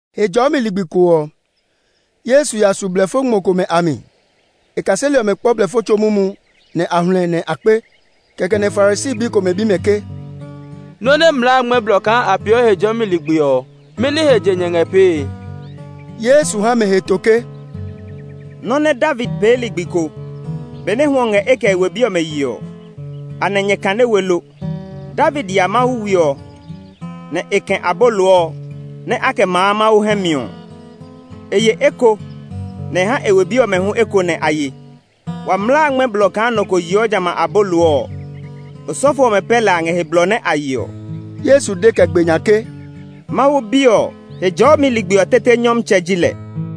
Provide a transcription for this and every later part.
Hejɔɔmi ligbi ko ɔ, Yesu ya su blɛfo ngmɔ komɛ a mi. E kaseli ɔmɛ kpɔ blɛfo tso mumu, nɛ a hluɛ, nɛ a kpe. Kɛkɛ nɛ Farisi bi komɛ bi mɛ ke, “Nɔ́ nɛ mlaa a ngmɛ́ blɔ kaa a peeɔ Hejɔɔmi ligbi ɔ, mɛni he je nyɛ ngɛ pee?” Yesu ha mɛ heto ke, “Nɔ́ nɛ David pee ligbi ko, benɛ hwɔ ngɛ e kɛ e we bi ɔmɛ yee ɔ, anɛ nyɛ kane we lo? David ya Mawu we ɔ mi, nɛ e kɛ̃ abolo ɔ nɛ a kɛ maa Mawu hɛ ɔ. E ye eko, nɛ e ha e we bi ɔmɛ hu eko nɛ a ye. Wa mlaa a ngmɛ́ blɔ kaa nɔ ko yeɔ jamɛ a abolo ɔ; osɔfo ɔmɛ pɛ lɛ a ngɛ he blɔ nɛ a yeɔ.” Yesu de kɛ gbe nya ke, “Mawu Bi ɔ, Hejɔɔmi ligbi ɔ tete Nyɔmtsɛ ji lɛ.”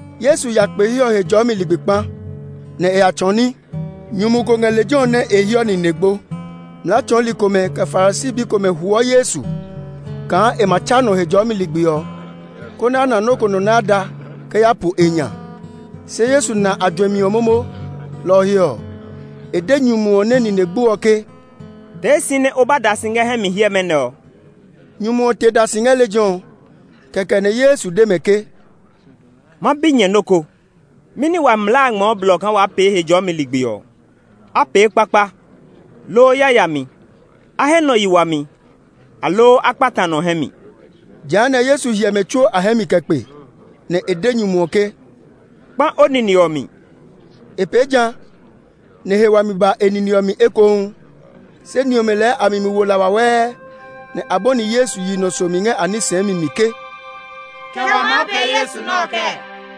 Yesu ya kpe he ɔ Hejɔɔmi ligbi kpa, nɛ e ya tsɔɔ ní. Nyumu ko ngɛ lejɛ ɔ nɛ e hiɔ nine gbo. Mlaa tsɔɔli komɛ, kɛ Farisi bi komɛ huɔ Yesu kaa e ma tsa nɔ Hejɔɔmi ligbi ɔ, konɛ a na nɔ́ ko nɛ a da nɔ kɛ ya po e nya. Se Yesu na a juɛmi ɔ momo; lɔ ɔ he ɔ, e de nyumu ɔ nɛ nine gbo ɔ ke, “Tee si nɛ o ba da si ngɛ hɛ mi hiɛmɛ nɛ ɔ!” Nyumu ɔ te da si ngɛ lejɛ ɔ. Kɛkɛ nɛ Yesu de mɛ ke, “Ma bi nyɛ nɔ́ ko. Mɛni wa mlaa a ngmɛɔ blɔ kaa waa pee Hejɔɔmi ligbi ɔ? A pee kpakpa, loo yayami? A he nɔ yi wami, aloo á kpata nɔ hɛ mi?” Jehanɛ, Yesu hyɛ mɛ tsuo a hɛ mi kɛ kpe, nɛ e de nyumu ɔ ke, “Kpã o nine ɔ mi!” E pee ja, nɛ he wami ba e nine ɔ mi ekohu. Se ni ɔmɛ lɛɛ a mi mi wo la wawɛɛ, nɛ a bɔni Yesu yi nɔ somi ngɛ a ní sɛɛmi mi ke, “Kɛ wa maa pee Yesu nɛ ɔ kɛɛ?”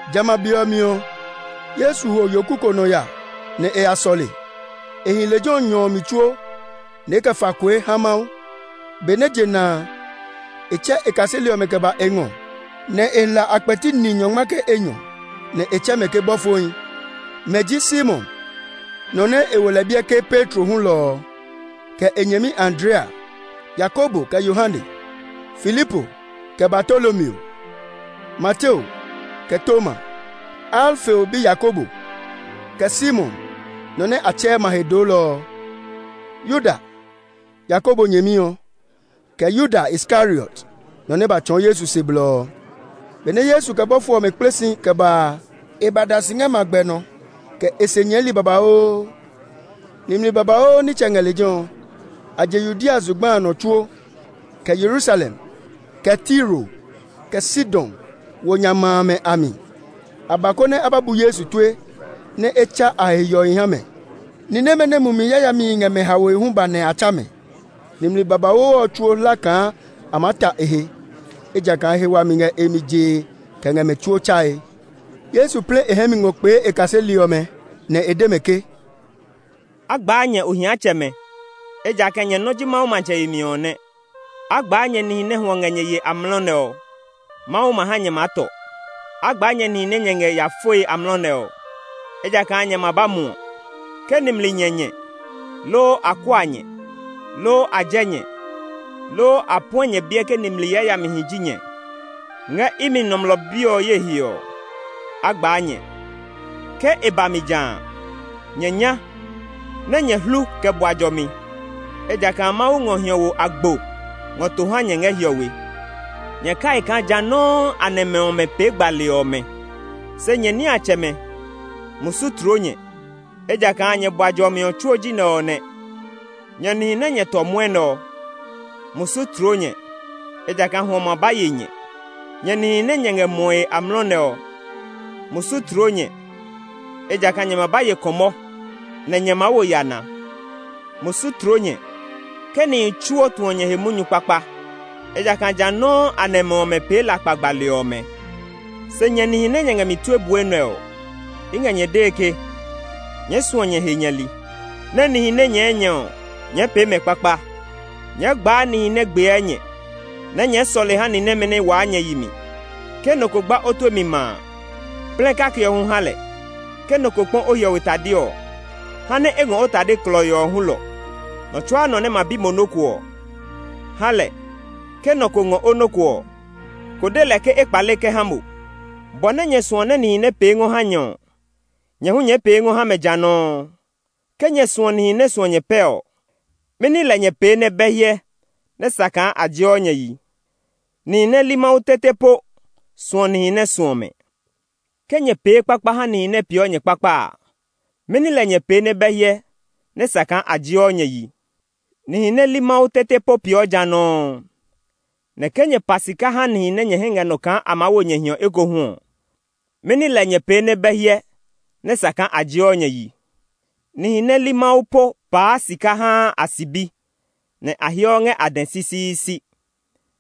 Jamɛ a be ɔ mi ɔ, Yesu ho yoku ko nɔ ya nɛ e ya sɔle; e hi lejɛ ɔ nyɔ ɔ mi tsuo, nɛ e kɛ fa kue ha Mawu. Benɛ je na a, e tsɛ e kaseli ɔmɛ kɛ ba e ngɔ, nɛ e hla a kpɛti ni nyɔngma kɛ enyɔ, nɛ e tsɛ mɛ ke bɔfohi. Mɛ ji Simon, nɔ nɛ e wo lɛ biɛ ke Petro hulɔ ɔ, kɛ e nyɛmi Andrea, Yakobo kɛ Yohane, Filipo kɛ Bartolomeo, Mateo kɛ Toma, Alfeo bi Yakobo, kɛ Simon, (nɔ nɛ a tsɛɛ ma he doolɔ ɔ); Yuda, Yakobo nyɛmi ɔ, kɛ Yuda Iskariot, nɔ nɛ ba tsɔɔ Yesu se blɔ ɔ. Benɛ Yesu kɛ bɔfo ɔmɛ kple si kɛ ba a, e ba da si ngɛ magbɛ nɔ, kɛ e se nyɛɛli babauu. Nimli babauu nitsɛ ngɛ lejɛ ɔ. A je Yudea zugba a nɔ tsuo, kɛ Yerusalem, kɛ Tiro, kɛ Sidon wo nya ma amɛ a mi. A ba, konɛ a ba bu Yesu tue, nɛ e tsa a he hiɔhi ha mɛ. Ni nɛmɛ nɛ mumi yayamihi ngɛ mɛ haoe hu ba nɛ a tsa mɛ. Nimli babauu ɔ tsuo hla kaa a maa ta e he, ejakaa he wami ngɛ e mi jee kɛ ngɛ mɛ tsuo tsae. Yesu plɛ e hɛ mi ngɔ kpee e kaseli ɔmɛ, nɛ e de mɛ ke, “A gbaa nyɛ, ohiatsɛmɛ, ejakaa nyɛ nɔ́ ji Mawu matsɛ yemi ɔ nɛ! “A gbaa nyɛ nihi nɛ hwɔ ngɛ nyɛ yee amlɔ nɛ ɔ; Mawu ma ha nyɛ maa tɔ! “A gbaa nyɛ nihi nɛ nyɛ ngɛ ya foe amlɔ nɛ ɔ, ejakaa nyɛ ma ba muɔ! “Ke nimli nyɛ nyɛ, loo a kua nyɛ, loo a jɛ nyɛ, loo a puɛ nyɛ biɛ ke nimli yayamihi ji nyɛ, ngɛ imi Nɔmlɔ Bi ɔ, ye he ɔ, á gbaa nyɛ! Ke e ba mi ja a, nyɛ nya, nɛ nyɛ hlu kɛ bua jɔmi, ejakaa Mawu ngɔ hiɔwo agbo ngɔ to ha nyɛ ngɛ hiɔwe. Nyɛ kai kaa ja nɔuu a nɛmɛ ɔmɛ pee gbali ɔmɛ. “Se nyɛ niatsɛmɛ, musu tloo nyɛ, ejakaa nyɛ bua jɔmi ɔ tsuo ji nɛ ɔ nɛ! “Nyɛ nihi nɛ nyɛ tɔ mwɔnɛ ɔ, musu tloo nyɛ, ejakaa hwɔ ma ba ye nyɛ! “Nyɛ nihi nɛ nyɛ ngɛ muɔe amlɔ nɛ ɔ, musu tloo nyɛ; ejakaa nyɛ ma ba ye kɔmɔ, nɛ nyɛ maa wo yana! “Musu tloo nyɛ, ke nihi tsuo tuɔ nyɛ he munyu kpakpa; ejakaa ja nɔuu a nɛmɛ ɔmɛ pee lakpa gbali ɔmɛ! “Se nyɛ nihi nɛ nyɛ ngɛ mi tue bue nɛ ɔ, i ngɛ nyɛ dee ke nyɛɛ suɔ nyɛ he nyɛli, nɛ nihi nɛ nyɛɛ nyɛ ɔ, nyɛɛ pee mɛ kpakpa; nyɛɛ gbaa nihi nɛ gbiɛɛ nyɛ, nɛ nyɛɛ sɔle ha ni nɛmɛ nɛ waa nyɛ yi mi. Ke nɔ ko gba o tue mi ma a, plɛ kake ɔ hu ha lɛ; ke nɔ ko kpɔ o hiɔwe tade ɔ, ha nɛ e ngɔ o tade klɔii ɔ hulɔ. Nɔ tsuaa nɔ nɛ ma bi mo nɔ́ ko ɔ, ha lɛ; ke nɔ ko ngɔ o nɔ́ ko ɔ, ko de lɛ ke e kpale kɛ ha mo. Bɔ nɛ nyɛ suɔ nɛ nihi nɛ pee ngɔ ha nyɛ ɔ, nyɛ hu nyɛɛ pee ngɔ ha mɛ ja nɔuu. “Ke nyɛ suɔ nihi nɛ suɔ nyɛ pɛ ɔ, mɛni lɛ nyɛ pee nɛ bɛ hyɛ nɛ sa kaa a jeɔ nyɛ yi? Nihi nɛ li Mawu tete po suɔ nihi nɛ suɔ mɛ! Ke nyɛ pee kpakpa ha nihi nɛ peeɔ nyɛ kpakpa a, mɛni lɛ nyɛ pee nɛ bɛ hyɛ nɛ sa kaa a jeɔ nyɛ yi? Nihi nɛ li Mawu tete po peeɔ ja nɔuu! Nɛ ke nyɛ pa sika ha nihi nɛ nyɛ hɛ ngɛ nɔ kaa a maa wo nyɛ hiɔ ekohu ɔ, mɛni lɛ nyɛ pee nɛ bɛ hyɛ nɛ sa kaa a jeɔ nyɛ yi? Nihi nɛ li Mawu po paa sika haa a sibi, nɛ a heɔ ngɛ a dɛ sisiisi!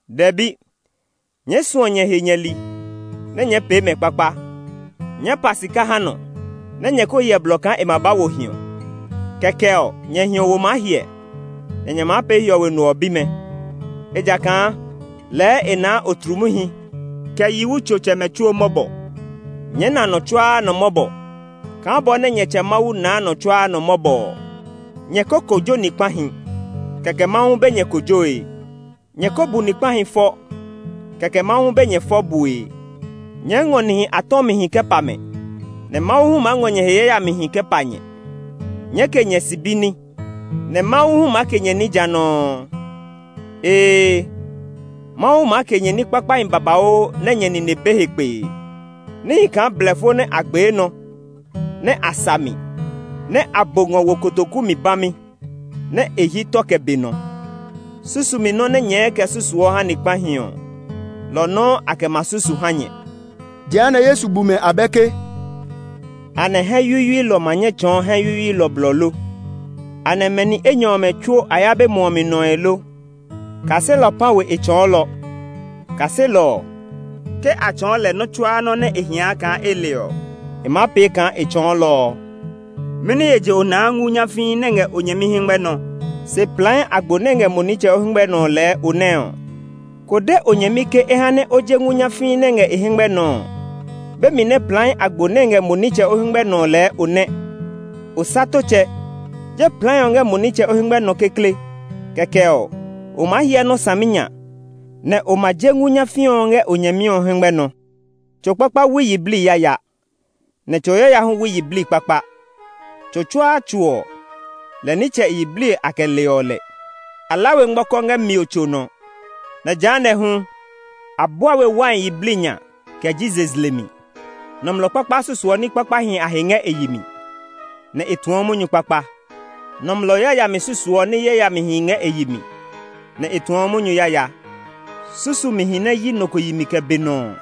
Dɛbi! Nyɛɛ suɔ nyɛ he nyɛli, nɛ nyɛɛ pee mɛ kpakpa; nyɛɛ pa sika ha nɔ, nɛ nyɛ ko hyɛ blɔ kaa e ma ba wo hiɔ. Kɛkɛ ɔ, nyɛ hiɔwo maa hiɛ, nɛ nyɛ maa pee Hiɔwe No ɔ bimɛ; ejakaa lɛɛ e naa otlumuhi, kɛ yiwutsotsɛmɛ tsuo mɔbɔ. Nyɛɛ na nɔ tsuaa nɔ mɔbɔ kaa bɔ nɛ nyɛ Tsɛ Mawu naa nɔ tsuaa nɔ mɔbɔ ɔ. “Nyɛ ko kojo ni kpahi, kɛkɛ Mawu hu be nyɛ kojoe; nyɛ ko bu ni kpahi fɔ, kɛkɛ Mawu hu be nyɛ fɔ bue; nyɛɛ ngɔ nihi a tɔmihi kɛ pa mɛ, nɛ Mawu hu maa ngɔ nyɛ he yayamihi kɛ pa nyɛ. Nyɛɛ ke nyɛ sibi ní, nɛ Mawu hu maa ke nyɛ ní ja nɔuu. Ee, Mawu maa ke nyɛ ní kpakpahi babauu nɛ nyɛ nine be he kpee, níhi kaa blɛfo nɛ a gbee nɔ, nɛ a sa mi, nɛ a bo ngɔ wo kotoku mi bami, nɛ e hyi tɔ kɛ be nɔ. Susumi nɔ́ nɛ nyɛɛ kɛ susuɔ nɔ́ ha ni kpahi ɔ, lɔ ɔ nɔuu a kɛ ma susu ha nyɛ.” Jehanɛ Yesu bu mɛ abɛ ke, “Anɛ hɛ yuyuilɔ ma nyɛ tsɔɔ hɛ yuyuilɔ blɔ lo? Anɛ mɛ ni enyɔ ɔmɛ tsuo a ya be muɔ mi nɔe o? Kaselɔ pã we e tsɔɔlɔ. Kaselɔ ɔ, ke a tsɔɔ lɛ nɔ́ tsuaa nɔ́ nɛ e hia kaa e le ɔ, e maa pee kaa e tsɔɔlɔ ɔ. “Mɛni he je o naa ngu nyafii nɛ ngɛ o nyɛmi hɛngmɛ nɔ, se plai agbo nɛ ngɛ mo nitsɛ o hɛngmɛ nɔ lɛɛ o nɛ ɔ? Ko de o nyɛmi ke e ha nɛ o je ngu nyafii nɛ ngɛ e hɛngmɛ nɔ ɔ, be mi nɛ plai agbo nɛ ngɛ mo nitsɛ o hɛngmɛ nɔ ɔ lɛɛ o nɛ. Osatotsɛ! Je plai ɔ ngɛ mo nitsɛ o hɛngmɛ nɔ kekle; kɛkɛ ɔ, o maa hyɛ nɔ́ saminya, nɛ o ma je ngu nyafii ɔ ngɛ o nyɛmi ɔ hɛngmɛ nɔ. “Tso kpakpa wui yiblii yaya, nɛ tso yaya hu wui yiblii kpakpa. Tso tsuaa tso ɔ, lɛ nitsɛ e yiblii a kɛ leɔ lɛ; a la we ngmɔkɔ ngɛ mio tso nɔ; nɛ jehanɛ hu, a bua we wai yiblii nya kɛ ji zezle mi. Nɔmlɔ kpakpa susuɔ ní kpakpahi a he ngɛ e yi mi, nɛ e tuɔ munyu kpakpa; nɔmlɔ yayami susuɔ ní yayamihi ngɛ e yi mi, nɛ e tuɔ munyu yaya. Susumihi nɛ hyi nɔ ko yi mi tɔtɔɔtɔ ɔ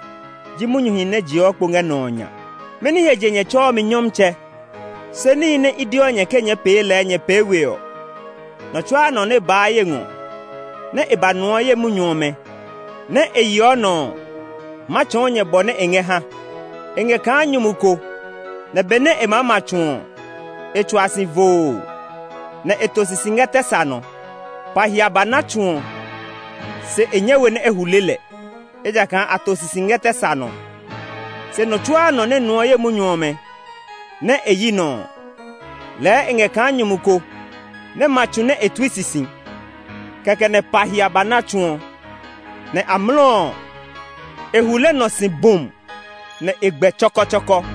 ji munyuhi nɛ jeɔ kpo ngɛ nɔ ɔ nya. “Mɛni he je nyɛ tsɛɔ mi ‘Nyɔmtsɛ’, se níhi nɛ i deɔ nyɛ ke nyɛɛ pee lɛɛ nyɛ pee we ɔ? Nɔ tsuaa nɔ nɛ baa ye ngɔ, nɛ e ba nuɔ ye munyu ɔmɛ, nɛ e yeɔ nɔ ɔ, ma tsɔɔ nyɛ bɔ nɛ e ngɛ ha. E ngɛ kaa nyumu ko nɛ benɛ e maa ma tsu ɔ, e tsua si voo, nɛ e to sisi ngɛ tɛ sa nɔ. Pa hia ba na tsu ɔ, se e nyɛ we nɛ e hule lɛ; ejakaa a to sisi ngɛ tɛ sa nɔ. Se nɔ tsuaa nɔ nɛ nuɔ ye munyu ɔmɛ, nɛ e yi nɔ ɔ, lɛɛ e ngɛ kaa nyumu ko nɛ ma tsu nɛ e tui sisi. Kɛkɛ nɛ pa hia ba na tsu ɔ, nɛ amlɔ ɔ, e hule nɔ si bum! Nɛ e gbɛ tsɔkɔtsɔkɔ.”